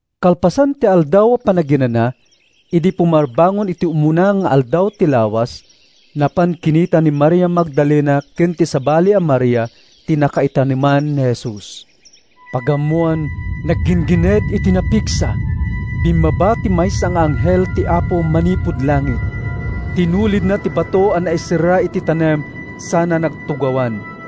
Kalpasan ti Aldaw a Panaginana, idi pumarbangon iti umuna nga aldaw ti lawas, napan kinita ni Maria Magdalena ken ti sabali a Maria ti nakaitaneman ni Jesus. Pagammoan, nagginggined iti napigsa. Bimmaba ti maysa nga anghel ti Apo manipud langit. Tinulidna ti bato a naiserra iti tanem sana nagtugawan.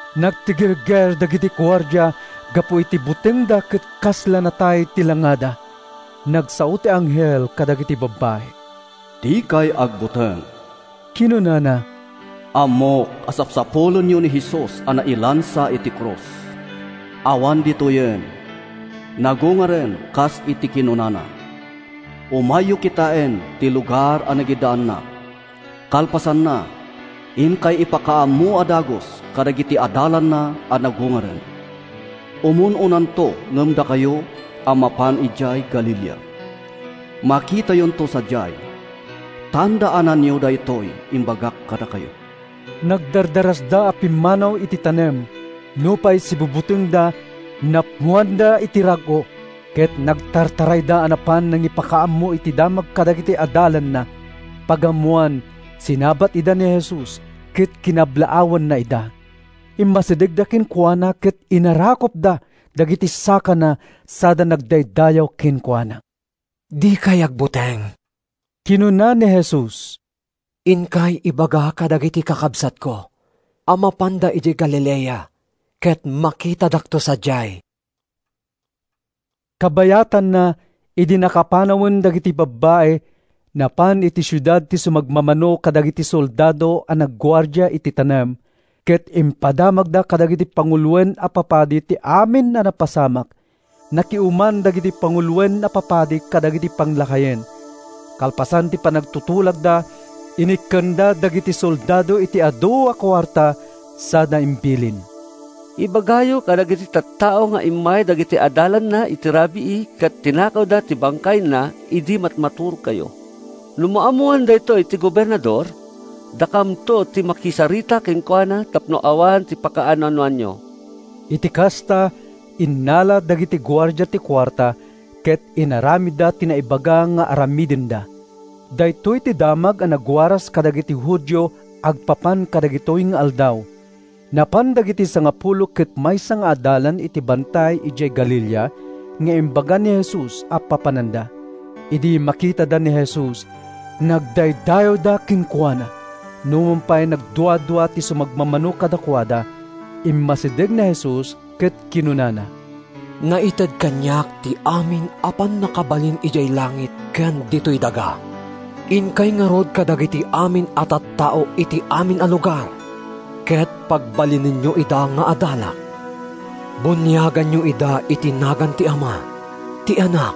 Nagtigerger dagiti guardia gapu iti butengda ket kasla natay ti langada. Nagsao ti anghel kadagiti babbai. “Dikay agbuteng,” kinunana. “Ammok a sapsapulenyo ni Jesus a nailansa iti krus. Awan ditoyen; nagungaren kas iti kinunana. Umayyo kitaen ti lugar a nagiddaanna. Kalpasanna, inkay ipakaammo a dagus kadagiti adalanna a nagungaren. Umun-unanto ngem dakayo a mapan idiay Galilea. Makitayonto sadiay! Tandaananyo daytoy imbagak kadakayo.” Nagdardarasda a pimmanaw iti tanem. Nupay sibubutengda, napnoanda iti rag-o. Ket nagtartarayda a napan nangipakaammo iti damag kadagiti adalanna. Pagammoan, sinabat ida ni Jesus ket kinablaawanna ida. Immasidegda kenkuana ket inarakupda dagiti sakana sada nagdaydayaw kenkuana. “Dikay agbuteng,” kinuna ni Jesus. “Inkay ibaga kadagiti kakabsatko a mapanda idiay Galilea ket makitadakto sadiay.” Kabayatanna, idi nakapanawen dagiti babbai, napan iti siudad ti sumagmamano kadagiti soldado a nagguardia iti tanem, ket impadamagda kadagiti panguloen a papadi ti amin a napasamak. Nakiuman dagiti panguloen a papadi kadagiti panglakayen. Kalpasan ti panagtutulagda, inikkanda dagiti soldado iti adu a kuarta sada imbilin, “Ibagayo kadagiti tattao nga immay dagiti adalanna iti rabii ket tinakawda ti bangkayna idi matmaturogkayo. No maammoan daytoy ti gobernador, dakamto ti makisarita kenkuana tapno awan ti pakaan-anoanyo.” Iti kasta, innala dagiti guardia ti kuarta ket inaramidda ti naibaga nga aramidenda. Daytoy ti damag a nagwaras kadagiti Judio agpapan kadagitoy nga aldaw. Napan dagiti sangapulo ket maysa nga adalan iti bantay idiay Galilea nga imbaga ni Jesus a papananda. Idi makitada ni Jesus, nagdaydayawda kenkuana, numan pay nagduadua ti sumagmamano kadakuada. Immasideg ni Jesus ket kinunana, “Naited kaniak ti amin a pannakabalin idiay langit ken ditoy daga. Inkay ngarud kadagiti amin a tattao iti amin a lugar, ket pagbalinenyo ida nga adalak: buniaganyo ida iti nagan ti Ama, ti Anak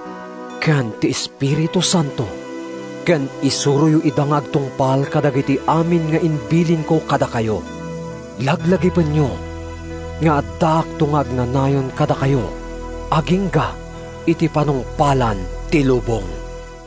ken ti Espiritu Santo, ken isuroyo ida nga agtungpal kadagiti amin nga imbilinko kadakayo. Laglagipenyo nga addaakto nga agnanayon kadakayo agingga iti panungpalan ti lubong.”